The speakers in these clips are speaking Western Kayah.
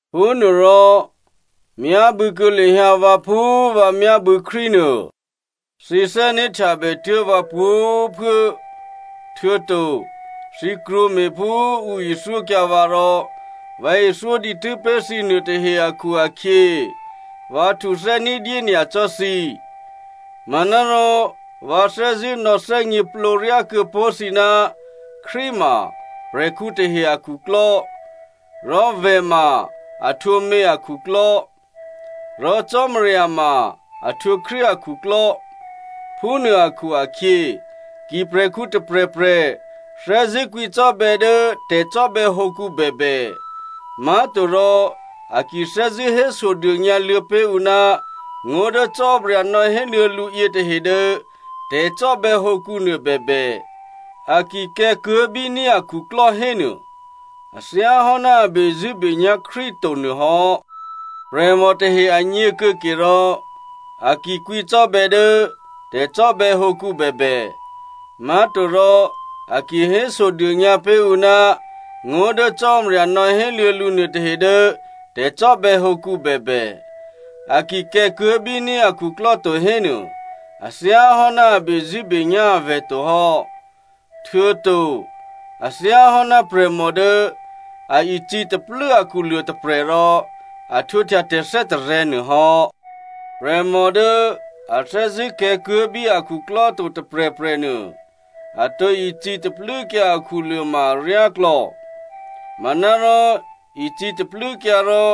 Phúnuôrò, myábû̌kuô̌ lahyǎ vǎ phú vǎ myábû̌ Krístu nuô. Thǐ thè́né̤htyabè tuố̤ vǎ pwǒ̤꤮ phuố, htuô̌to thǐ krwǒme̤ phú ǔ ithyókyǎ vǎ rò vǎ ithyó dǐtû́ pé̤ thǐ nuôtahe akhu-akhyě vǎ htuthè́ ní̤dyé nyacò́ thǐ. Manárò vǎ thè́zṳ̂́ nò̌ thè́gněplǒ ryá kuô̌ pó̤ thǐ ná Krístu ma prè̤khǔ tahe akhuklò́. Rò vè̤ ma a htwǒ mě akhuklò́, rò Cò́marya ma a htwǒ Krístu akhuklò́. Phúnuô akhu-akhyě, ki prè̤khǔ tôprè̤prè̤ thè́zṳ̂́ kwǐcò́bè̌ dố tè̤cò́bè̌hǒkǔ bèbè má̤torò a ki thè́zṳ̂́ hésodônyǎ luô̌ pé̤ ǔ ná ngó̤ dố Cò́marya nò̌héluô̌ lǔ yětahe dố tè̤cò́bè̌hǒkǔ nuô bèbè, a ki kè̤̌kuố̤ bíní̤ akhuklò́ hénuô, a thyá hò́ ná a bezṳ̂́benyá̤ Krístu to nuô hò́. Prè̤mò tahe agně kuô̌ke rò, a ki kwǐcò́bè̌ dố tè̤cò́bè̌hǒkǔ bèbè má̤torò a ki hésodônyǎ pé̤ ǔ ná ngó̤ dố Cò́marya nò̌héluô̌ lǔ nuôtahe dố tè̤cò́bè̌hǒkǔ bèbè, a ki kè̤̌kuố̤ bíní̤ akhuklò́ to hénuô, a thyá hò́ ná a bezṳ̂́benyá̤ avè̤ to hò́. Htuô̌to a thyáhò́ ná prè̤mò dố a icǐ taklû́ akhuluô̤ tôprè̤ rò a htwǒhtya tè̤thè́tarè̤̌ nuô hò́. Prè̤mò dố a thè́zṳ̂́ kè̤̌kuố̤ bí a khuklò́ to tôprè̤prè̤ nuô, a tǒ icǐ taklû́kyǎ akhuluô̤ ma aryáklò̌. Manárò icǐ taklû́kyǎ rò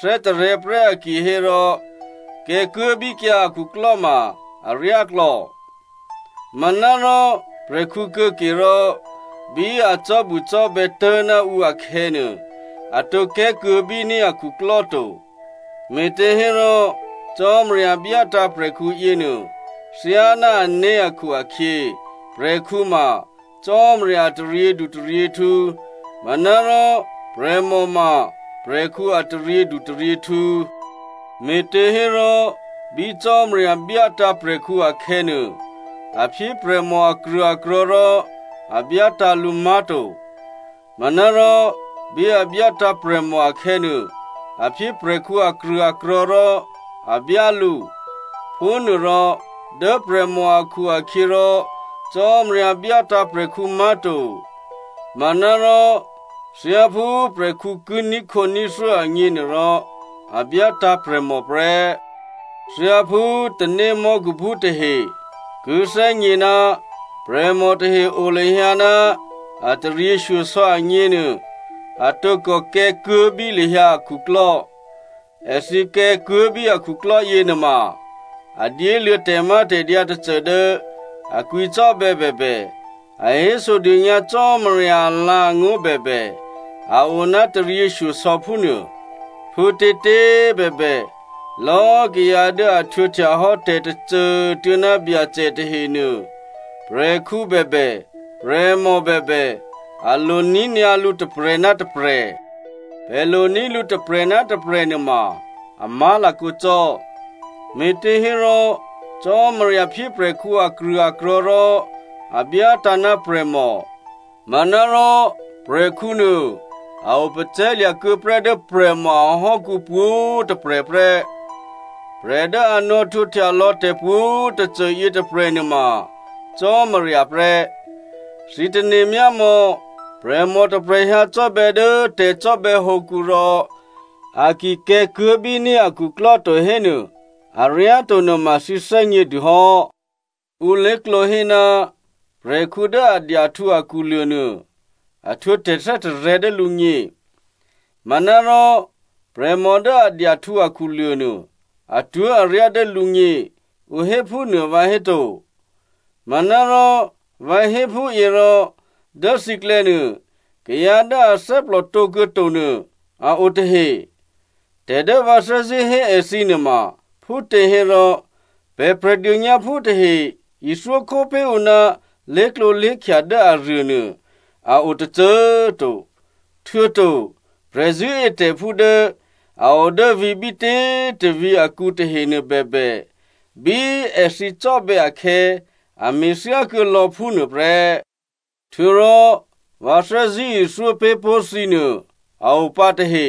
thè́tarè̤̌ prè́ a kihérò, kè̤̌kuố̤ bíkyǎ akhuklò́ ma aryáklò̌. Manárò prè̤khǔ kuô̌ke rò bí a cò́bucò́bè̌ tố̤ ná ǔ akhè̌nuô, a tǒ kè̤̌kuố̤ bíní̤ akhuklò́ to. Me̤těhérò Cò́marya byátǎ̤ prè̤khǔ yěnuô thyáná ané̤ akhu-akhyě, prè̤khǔ ma Cò́marya a taryědutaryěhtǔ, manárò prè̤mò ma prè̤khǔ a taryědutaryěhtǔ. Me̤těhérò bí Cò́marya byátǎ̤ prè̤khǔ akhè̌nuô, a phyé prè̤mò akrṳ̂akrò̤̌ rò a byátǎ̤ lǔ má̤to. Manárò bí a byátǎ̤ prè̤mò akhè̌nuô, a phyé prè̤khǔ akrṳ̂akrò̤̌ rò a byá lǔ. Phúnuôrò dố prè̤mò akhu-akhyěrò Cò́marya byátǎ̤ prè̤khǔ má̤to. Manárò thyáphú prè̤khǔ ki ní̤khǒní̤thyó agněnuôrò, a byátǎ̤ prè̤mò prè́. Thyáphú tanémò́khuphú tahe ki thè́gně ná prè̤mò tahe o lahyǎ ná a taryěshyosò̌ agněnuô, a tǒkò kè̤̌kuố̤ bí lahyǎ akhuklò́. Èthǐ kè̤̌kuố̤ bí akhuklò́ yěnuôma a dyéluô̌ tè̤mátè̤dyǎ tôcô dố a kwǐcò́bè̌ bèbè, a hésodônyǎ Cò́marya alǎ̤angó̤ bèbè, a o ná a taryěshyosò̌ phúnuô. Phútětě꤮ bèbè, lò̌꤮ kayǎ dố a htwǒhtya hò́ tè̤tôcô꤮ tuô̌ ná Byacè tahenuô, prè̤khǔ bèbè, prè̤mò bèbè, a lo ní̤ nyǎ lǔ tôprè̤ ná tôprè̤. Pè̤ lo ní̤ lǔ tôprè̤ ná tôprè̤ nuôma a má̤lakǒ cò́. Me̤těhérò Cò́marya phyé prè̤khǔ akrṳ̂akrò̤̌ rò a byátǎ̤ ná prè̤mò. Manárò prè̤khǔ nuô, a opacè̤̌lya̤ kuô̌ prè́ dố prè̤mò ahò́kǔ pwǒ̤꤮ tôprè̤ prè́. Prè̤ dố a nò̌htwǒhtya lò̌ tè̤pwǒ̤꤮ tôcô yětôprè̤ nuôma Cò́marya prè́. Thǐ tane̤myámò̌, prè̤mò tôprè̤ hyǎ cò́bè̌ dố tè̤cò́bè̌hǒkǔ rò a ki kè̤̌kuố̤ bíní̤ akhuklò́ to hénuô, aryáto nuôma thǐ thè́gnědû hò́. Ǔ lé̤klǒ hé, prè̤khǔ dố a dyahtǔ akhuluô̤ nuô, a htwǒ tè̤thè́tarè̤̌ dố lǔgně, manárò prè̤mò dố a dyahtǔ akhuluô̤ nuô, atwó̤aryá dố lǔgně, ǔ hé phúnuô vǎhéto? Manárò, vǎ hé phúyě rò dố thǐklè̌ nuô, kayǎ dố athè́plò tǒ kuô̌ to nuô a o tahe. Tè̤ dố vǎ thè́zṳ̂́ hé èthǐ nuôma phútěhérò, pè̤ Prè̤dônyǎphú tahe ithyókhó pé̤ ǔ ná lé̤klǒlé̤khya dố aruônuô a o tôcô꤮ to. Htuô̌to prè̤zṳ̂́etè̤phú dố a o dố vǐ̤ bítě꤮ tôvǐ̤ akǔ tahenuô bèbè, bí èthǐ cò́bè̌ akhè̌, a me̤thyá kuô̌ lò̌ phúnuô prè́. Htuô̌rò vǎ thè́zṳ̂́ ithyó pé̤ pó̤ thǐ nuô a o pǎ tahe.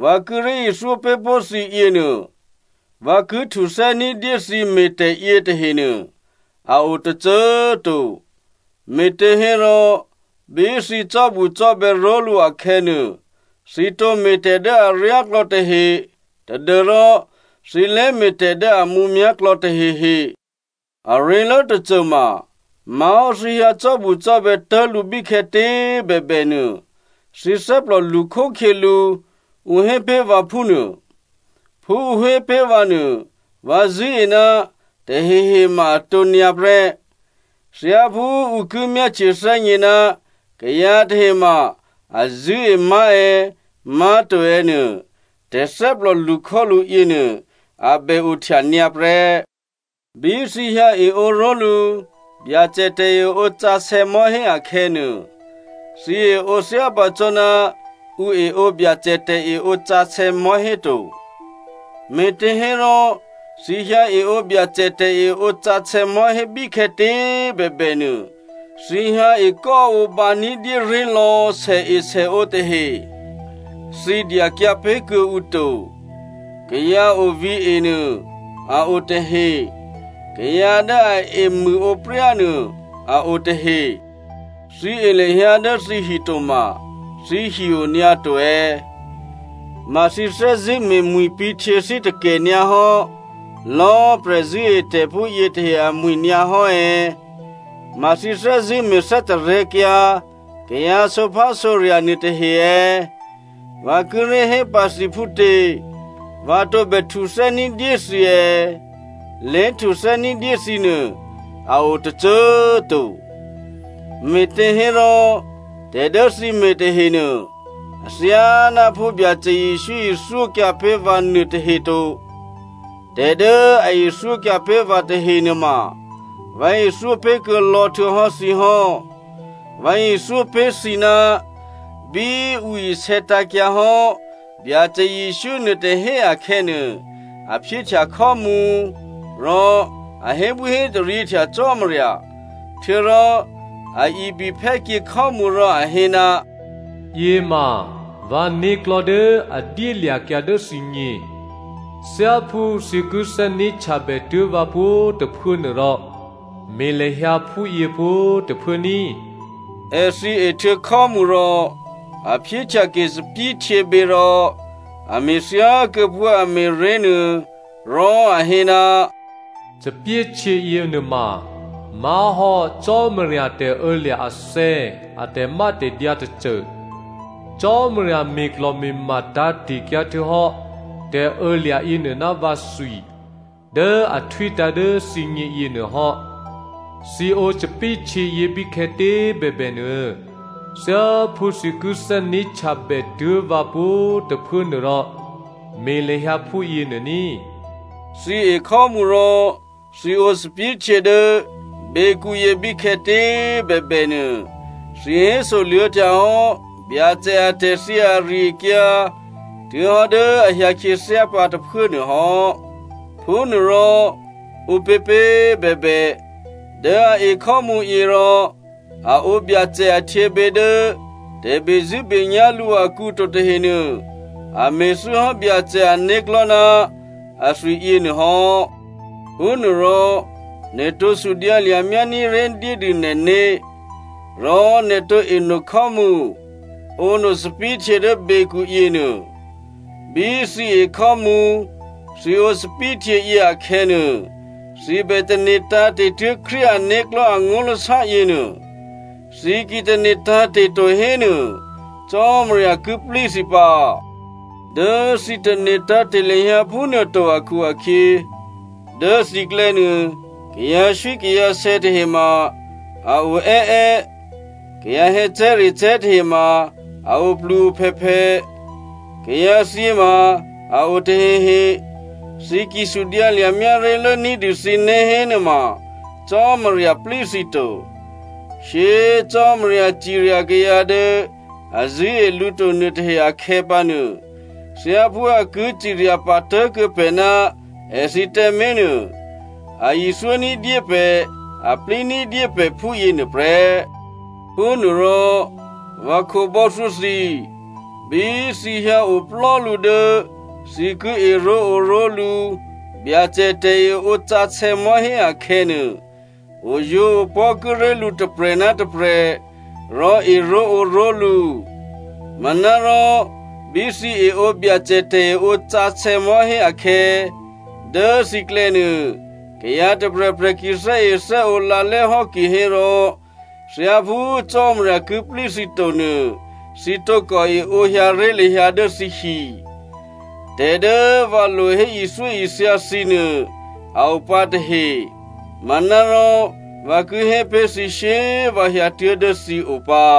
Vǎ kíré̤ ithyó pé̤ pó̤ thǐ yěnuô, vǎ ki htuthè́ ní̤dyé thǐ me̤tè̤ yětahenuô a o tôcô꤮ to, me̤těhérò bí thǐ cò́bucò́bè̌ ró̤lǔ akhè̌nuô, thǐ tǒme̤ tè̤ dố aryáklò̌ tahe tadû́rò thǐ lé me̤tè̤ dố a mǔmyá̤ klò̌ tahehe. Aré̤lố tôcô ma má̤hò́ thǐ hyǎ cò́bucò́bè̌ tố̤lǔ bíkhè̌tě꤮ bèbè nuô, thǐ thè́plò lṳkhókhyělǔ, ǔ hé pé̤ vǎ phúnuô. Phú ǔ hé pé̤ vǎ nuô vǎ zṳ̂́e ná tahehe ma atǒ nyǎ prè́. Thyáphú ǔ ki myáhtye thè́gně ná kayǎ tahe ma a zṳ̂́e má̤ è̌, má̤to è̌ nuô, tè̤thè́plò lṳkhólǔ yěnuô a bè ohtya nyǎ prè́. Bí thǐ hyǎ eǒ ró̤lǔ Byacè tè̤eǒ sǎsè̌ mò̤́hé akhè̌nuô, thǐ eǒ thyápǎ cò́ ná ǔ eǒ Byacè tè̤eǒ sǎsè̌ mò̤́hé to. Me̤těhérò, thǐ hyǎ eǒ Byacè tè̤eǒ sǎsè̌ mò̤́hé bíkhè̌tě꤮ bèbè nuô, thǐ hyǎ ekò́ǒbǎ ní̤dyé ré̤lò̌ sèesèǒ tahe, thǐ dyakyǎ pé̤ kuô̌ǔ to. Kayǎ ovǐ̤e nuô a o tahe. Kayǎ dố a emṳ̂ǒpryá nuô a o tahe. Thǐ e lahyǎ dố thǐhi toma thǐhi o nyǎ to è̌? Ma thǐ thè́zṳ̂́ me̤mwi̤pǐ̤htyěthí takè nyǎ hò́ lò̌꤮ prè̤zṳ̂́etè̤phú yětahe amwi̤ nyǎ hò́ è̌? Ma thǐ thè́zṳ̂́ me̤ thè́tarè̤̌kyǎ kayǎ sǒphásǒrya̤ nuôtahe è̌? Vǎ kíré̤ hé pǎ thǐ phútě? Vǎ tǒbè htuthè́ ní̤dyé thǐ è̌? Lé̤htuthè́ ní̤dyé thǐ nuô a o tôcô꤮ to. Me̤těhérò, tè̤ dố thǐ me̤ tahenuô, athyáná phú Byacè Jesǔ ithyókyǎ pé̤ vǎ nuôtahe to. Tè̤ dố a ithyókyǎ pé̤ vǎ tahenuôma, vǎ ithyó pé̤ kuô̌ lò̌ htuô̌hò́ thǐ hò́. Vǎ ithyó pé̤ thǐ, bí ǔ isè̌tǎ̤kyǎ hò́ Byacè Jesǔ nuôtôhé akhè̌nuô, a phyéhtya khò́mǔ, rò a hébwíhétaryěhtya Cò́marya, htuô̌rò a ibiphè́kyě khò́mǔ rò a hé, “Yě ma vǎ né̤klò̤́ dố a dyélya̤kyǎ dố thǐgně. Thyáphú thǐ ki thè́né̤htyabè tuố̤ vǎ pwǒ̤꤮ tôphuố nuôrò, me̤ lahyǎ phúyě pwǒ̤꤮ tôphuố ní꤮.” Èthǐ ehtuô̌ khò́mǔ rò, a phyéhtyake thòbǐthèhtyěbě rò a me̤thyá kuô̌ phú a me̤ré̤ nuô, rò a hé, “Thòbǐthèhtyě yěnuôma má̤hò́ Cò́marya tè̤ô̌lya̤ athè̌ a tè̤mátè̤dyǎ tôcô. Cò́marya me̤klò̤me̤ma tǎ̤te̤kyǎ htuô̌hò́ tè̤ô̌lya̤ yěnuô ná vǎthwi dố a htwítǎ̤ dố thǐgně yěnuô hò́. Thǐ ǒ thòbǐthèhtyě yě bíkhè̌tě꤮ bèbènuô, thyáphú thǐ ki thè́né̤htyabè tuố̤ vǎ pwǒ̤꤮ tôphuố nuôrò, me̤ lahyǎ phúyě nuô ní꤮.” Thǐ e khò́mǔ rò thǐ ǒ thòbǐthèhtyě dố běkǔyě bíkhè̌tě꤮ bèbè nuô, thǐ hésoluô̌htya hò́ Byacè atè̤thyě ari-akyǎ tuố̤ hò́ dố a hyǎ khyěthyá pǎ tôphuố nuô hò́. Phúnuôrò, ǔpěpě꤮ bèbè dố a e khò́mǔyě rò a ǒ Byacè ahtyěbě dố tè̤bezṳ̂́benyá̤ lǔ akǔ to tahenuô, a me̤thû́ hò́ Byacè ané̤klò̤́ ná athwi yěnuô hò́. Phúnuôrò nè̤ tǒ sudyǎlya̤ myání̤ré̤ dyédû nè̤né̤, rò nè̤ tǒ eno khò́mǔ, ǒno thòbǐthèhtyě dố běkǔ yěnuô. Bí thǐ e khò́mǔ, thǐ ǒ thòbǐthèhtyě yě akhè̌nuô, thǐ bè tane̤ tǎ̤te̤ tuố̤ Krístu ané̤klò̤́ angó̤lasá yěnuô. Thǐ ki tane̤ tǎ̤te̤ to hénuô, Cò́marya ki plí thǐ pǎ. Dố thǐ tane̤ tǎ̤te̤ lahyǎ phúnuô to akhu-akhyě, dố thǐklè̌ nuô, kayǎswíkayǎsè̌ tahe ma a o è́è́, kayǎ hè̌cè̤́recè̤́ tahe ma a oplu-ophèphè, kayǎthyě ma a o tahehe. Thǐ ki sudyǎlya̤ myáré̤lố ní̤dû thǐné̤ hénuôma, Cò́marya plí thǐ to. Shyé꤮ Cò́marya cirya kayǎ dố a zṳ̂́e lǔ to nuôtahe akhè̌pǎnuô, thyáphú a ki cirya pǎ tố̤kuô̌ pè̤ ná èthǐ tǎmé̤ nuô, a ithyó ní̤dyé pè̤, a plí ní̤dyé pè̤ phúyě nuôprè́. Phúnuôrò, vǎ khǒbò́thyó thǐ꤮ bí thǐ hyǎoplò́ lǔ dố thǐ ki eró̤ǒró̤lǔ Byacè tè̤eǒ sǎsè̌ mò̤́hé akhè̌nuô, oyǒopò̤́ kíré̤ lǔ tôprè̤ ná tôprè̤ rò eró̤ǒró̤lǔ. Manárò bí thǐ eǒ Byacè tè̤eǒ sǎsè̌ mò̤́hé akhè̌, dố thǐklè̌ nuô, kayǎ tôprè̤prè̤ ki thè́ethè́ǒ lǎlè́ hò́ kihérò thyáphú Cò́marya ki plí thǐ to nuô, thǐ tǒkò eǒ hyǎ ré̤ lahyǎ dố thǐhi. Tè̤ dố vǎ lo hé ithyóithya thǐ nuô a o pǎ tahe, manárò vǎ ki hé pé̤ thǐ shyé꤮ vǎ hyǎtuố̤ dố thǐ o pǎ.